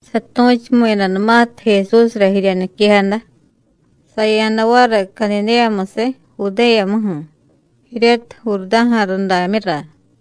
Satu̱chumu̱yadanumatiy Jesúsra jirya niquejada, saya̱da variy Cadidéyamusiy Judéyamuju̱ jiryatiy Jurdá̱ja̱ rudamyura.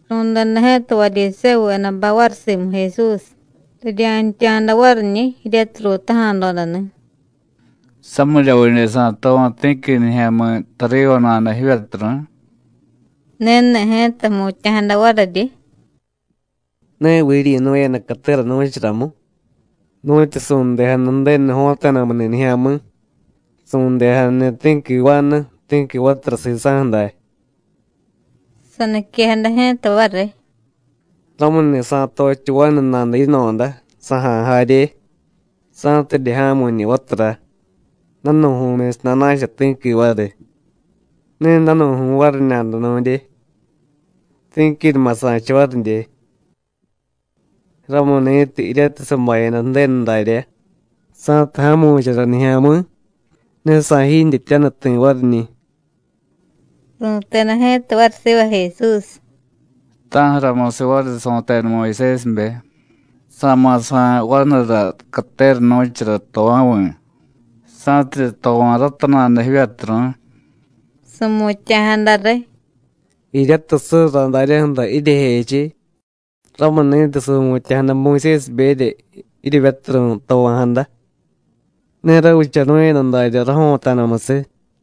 Ru̱deda ji̱ta Varyisévuvedabay variy simu Jesús, rirya̱ntya̱da variñi̱ jiryatiy ruutaja̱dodani̱: “¿Samiryavidye sa̱tova̱ ti̱qui nijya̱mi̱ tariva nada jivyaturu̱y?” Ni̱ni̱ ji̱ta jmutya̱jada variryi: “¿Neviy jiryi̱nu̱yada catera nu̱charamu, nu̱tyu su̱ndejada Ju̱denu jo̱ta̱damuni̱ nijya̱mi̱, su̱ndejadani̱ ti̱qui vanu, ti̱qui vatura sisa̱ju̱ day?” Saniquejada ji̱ta variy: “Ramuni̱ sa̱tochiy vanu nada yino̱da, saja̱y jarye, sa̱tidye ja̱mu̱ñi̱ vatura, danu̱ju̱myusiy nana̱cha ti̱qui variy. Ne danu̱ju̱y variñada nu̱ndye, ti̱quinuma sa̱cha varidye. Ramuni̱tiy, jiryatiy sabayada Ju̱denu daryá, sa̱tiy ja̱mu̱chara nijya̱mi̱, ne sa̱jiintyetyaniy ti̱ variñi̱.” Ru̱teda ji̱ta variy siva Jesús: “¿Ta̱ju̱ramusiy variy su̱teda Muyusésibe: Sa̱ma̱ sa̱y vanura catera nu̱chara tová̱vi̱, sa̱tidye tova̱ rata nada jivyaturu̱y?” Su̱mutya̱jada riy: “Jiryatiy surra daryaju̱ra jiryejechiy, ramuni̱tiy su̱mutya̱jada Muyusésiberya jiryevyaturu̱y tova̱jada. Ne ravichanu̱yada daryá jo̱ta̱damusiy.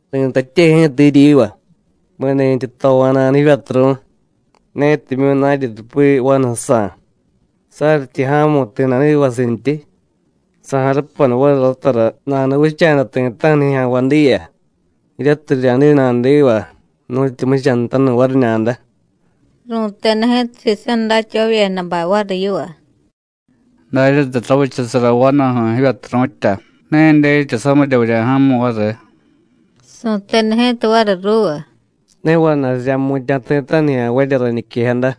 Ri̱tatye ji̱ta jiryiva: Mi̱ni̱tyi tova̱nada jivyaturu̱y, netimyu̱ naryi rupi vanujsa̱, saryityi ja̱mu̱y ti̱ nadivasintyi, sa̱jarupanu variy ratara nanuvicha̱da ti̱ta̱ju̱ nijya̱nvay diya, jiryatiy rirya̱diy nadiva nu̱tyu jmuchanutanu̱y variñada.” Ru̱teda ji̱ta sisa̱ datyavavyedabay variy yiva: “Daryatiy ravichasara vanuju̱ jivyaturu̱tya, ne dyetya samirya vurya̱ja̱mu̱y variy.” Su̱teda ji̱ta variy ruuva: “Ne vana̱y rirya̱jmutya̱ ti̱ta̱ju̱ nijya̱nvarya rañiquejada,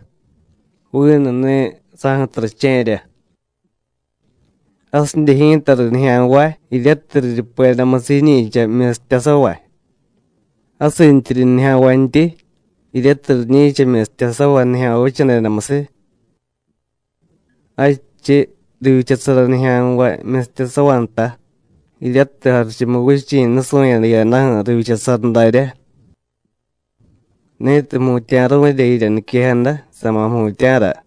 vinuni̱ saju̱tiy rache̱rya. Jasidye ji̱tariy nijya̱nvay jiryatiy riryupedamusiy jiñi̱cha myistyasavay. Jasintyiryi nijya̱nvantyi jiryatiy riñi̱cha myistyasavay nijya̱nvay vichadedamusiy. Jadchiy, rivyichasara nijya̱nvay myistyasavay nta, jiryatiy Jarichumuvichi̱ nusu̱yada jiyadaju̱ rivyichasara daryá. Ni̱tiy jmutya̱ru̱rya jirya niquejada, sa̱ma̱ jmutya̱ra.”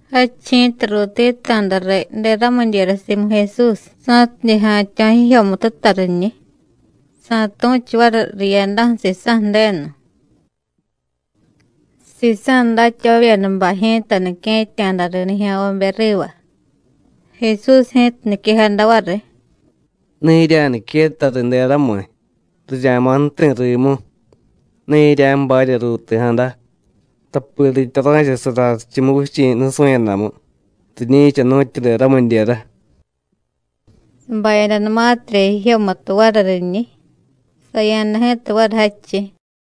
Jadchiy ji̱ta ruuti̱ta̱da riy deramidyera simu Jesús sa̱tidye ja̱tyo̱ jijyomututa riñiy, sa̱tu̱chu variy riyadaju̱ sisa̱ Ju̱denu. Sisa̱ datyavavyedabay ji̱ta nique̱tya̱da riy nijya̱nvabe riva. Jesús ji̱ta niquejada variy: “Ne jirya̱niquetta riy deramiy, rirya̱ma̱ ju̱ti̱ rimu. Ne jirya̱jbarya ruuti̱jada, tapi ritya ra̱chasara Jarichumuvichi̱ nusu̱yadamu, riñi̱cha nu̱tyu deramidyera.” Sabayadanumatirya jijyomutu variy riñiy, saya̱da ji̱ta variy jadchiy.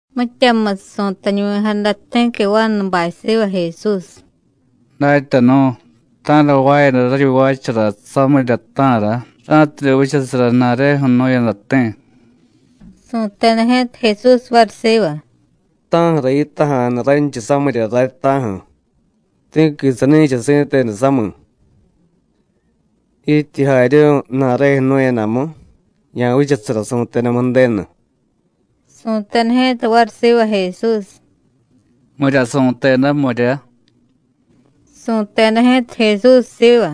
Mityamusiy su̱tañuvi̱jada ti̱qui vanubay siva Jesús: “Datyanu̱, ¿ta̱ra jvaayada raryi jvaachara samirya, ta̱ra? ra̱tidye vichasara ju̱na̱reju̱ jnu̱yadati̱.” Su̱teda ji̱ta Jesús variy siva: “¿Ta̱ju̱ra yitaja̱nu ranchiy samirya ray, ta̱ju̱? Ti̱qui sani̱cha si̱tenu sami̱. Jityi jaryu̱y ju̱na̱reju̱ jnu̱yadamu, ya̱vichasara su̱tedamu Ju̱denu.” Su̱teda ji̱ta variy siva Jesús: “¿Mirya su̱teda, mirya?” Su̱teda ji̱ta Jesús siva: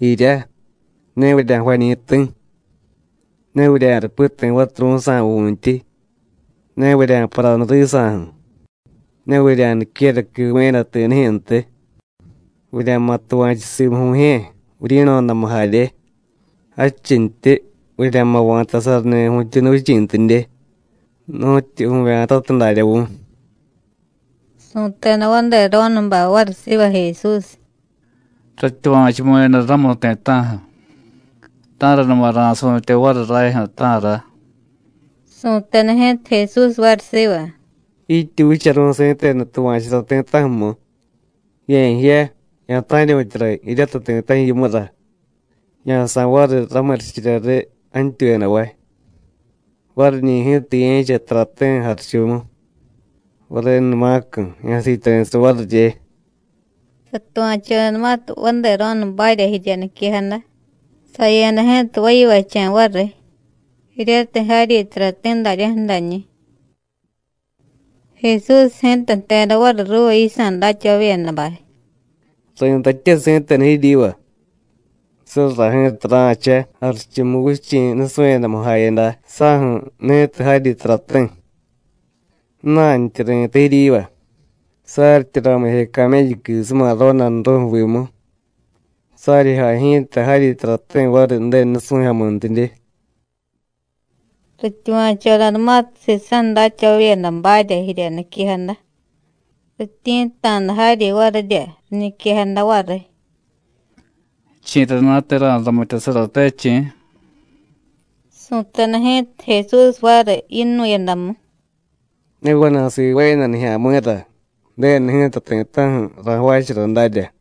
“Jirya: Ne vurya̱jvañi̱ ti̱, ne vurya̱rupi ti̱ vaturu̱jsa̱ vu̱ntyi, ne vurya̱paranu risa̱ju̱, ne vurya̱niquera quivu̱yada ti̱nijyu̱ntiy. Vurya̱ma̱ tuva̱chu simu vu̱jye̱, vuryi̱no̱damu jarye, jadchintyi: Vurya̱ma̱ va̱tasarani̱ vu̱tyuunuvichi̱ntidye, nu̱tyu vu̱vya̱tatiy darya vu̱y.” Su̱teda vadero̱nubay variy siva Jesús: “Ratyuva̱chumu̱yada ramu ti̱ta̱ju̱. ¿Ta̱ranuma ra̱su̱tye variy rajyu̱, ta̱ra?” Su̱teda ji̱ta Jesús variy siva: “Jityi vicharu̱y si̱tenu tuva̱churá ti̱ta̱ju̱mu, ye̱jiya, ya̱ta̱ryu̱tyara jiryatiy ti̱ta̱ju̱ yimura, ya̱sa̱y variy ramurichirya riy jantyuyadavay. Variñi̱ ji̱ta ye̱cha tarati̱ jarichumu. Varenumacu̱, ya̱siityari̱sara varirye.” Satuva̱chodanumatiy vadero̱nubarya jirya niquejada, saya̱da ji̱ta vayivacha̱ variy, jiryatiy jaryi tarati̱ daryaju̱ dañi̱. Jesús ji̱ta jteda variy ruuva yisa̱ datyavavyedabay: “Ri̱tatye si̱tenu jiryiva: Surra ji̱ta ra̱cha Jarichumuvichi̱ nusu̱yadamu jayada saju̱ ni̱tiy jaryi tarati̱. Ju̱na̱ntyi ri̱tay jiryiva: Saryityi ramije camélluquisuma rodanru̱ju̱ vimu, saryi jay ji̱ta jaryi tarati̱ variy Ju̱denu nusu̱jyomuntidye.” Rityuva̱chodanumatiy sisa̱ datyavavyedabarya jirya niquejada, rityi̱tta̱da jaryi varirya, riñiquejada variy: “¿Chi̱rana̱te ra̱ramityasarate, chi̱?” Su̱teda ji̱ta Jesús variy yinu̱yadamu: “Ne vana̱y sivaayada nijya̱mi̱ra, Ju̱denu ji̱ta ti̱ta̱ju̱ ra̱jvaachara darya.”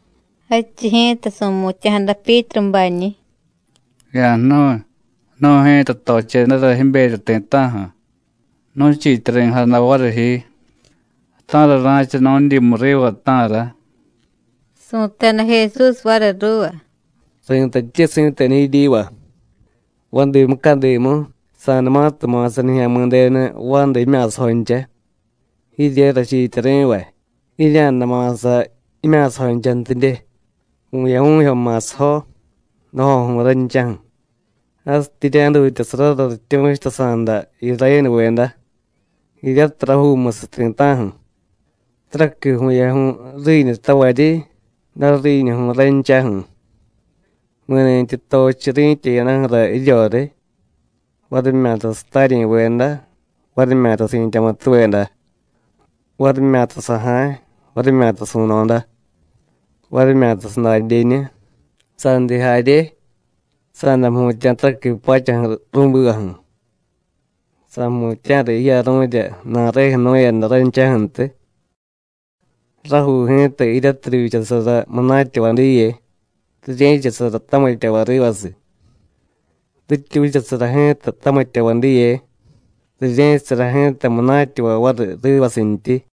Jadchiy ji̱ta su̱mutya̱jada Pyítrubañi̱: “Ya̱jnu̱y, nu̱y ji̱ta tochedara jiberya ti̱ta̱ju̱, nu̱chiityari̱jada variy ji. ¿Ta̱ra ra̱cha nu̱dyimu riva, ta̱ra?” Su̱teda Jesús variy ruuva: “Ri̱tatye si̱tenu jiryiva: Vadi mucadimu, sa̱numatiy ma̱sa Nijya̱mi̱denu vanda jimya̱sajoncha, jirye rachiityari̱vay, jirya̱day ma̱sa jimya̱sajonchantidye, vu̱yaju̱jyo ma̱sajo, dajoju̱y ranchaju̱, jasityi jirya̱jdutyasarara rityu̱chutasa̱da Irayénuveda, jiryatiy rajuumusiy ti̱ta̱ju̱, taraqui vu̱yaju̱y ju̱riiñutavaryi, dariiñuju̱y ranchaju̱. Mi̱ni̱tyi tochiy ri̱tya jiyadaju̱ra jiryoriy, varimyata sataryi̱veda, varimyata si̱tyamutuveda, varimyata saja̱y, varimyata su̱no̱da, varimyata sadadyeñu, sandiy jarye, sa̱day jmutya̱ taraqui pachaju̱ ru̱bivaju̱, sa̱jmutya̱ra jiyaru̱rya ju̱na̱reju̱ jnu̱yada ranchaju̱ntiy. Rajuu ji̱ta jiryatiy rivyichasara munatyavay diye, rirye̱chasara tamityavay rivasiy. Rityi vichasara ji̱ta tamityavay diye, rirye̱chasara ji̱ta munatyavay variy rivasintyi.”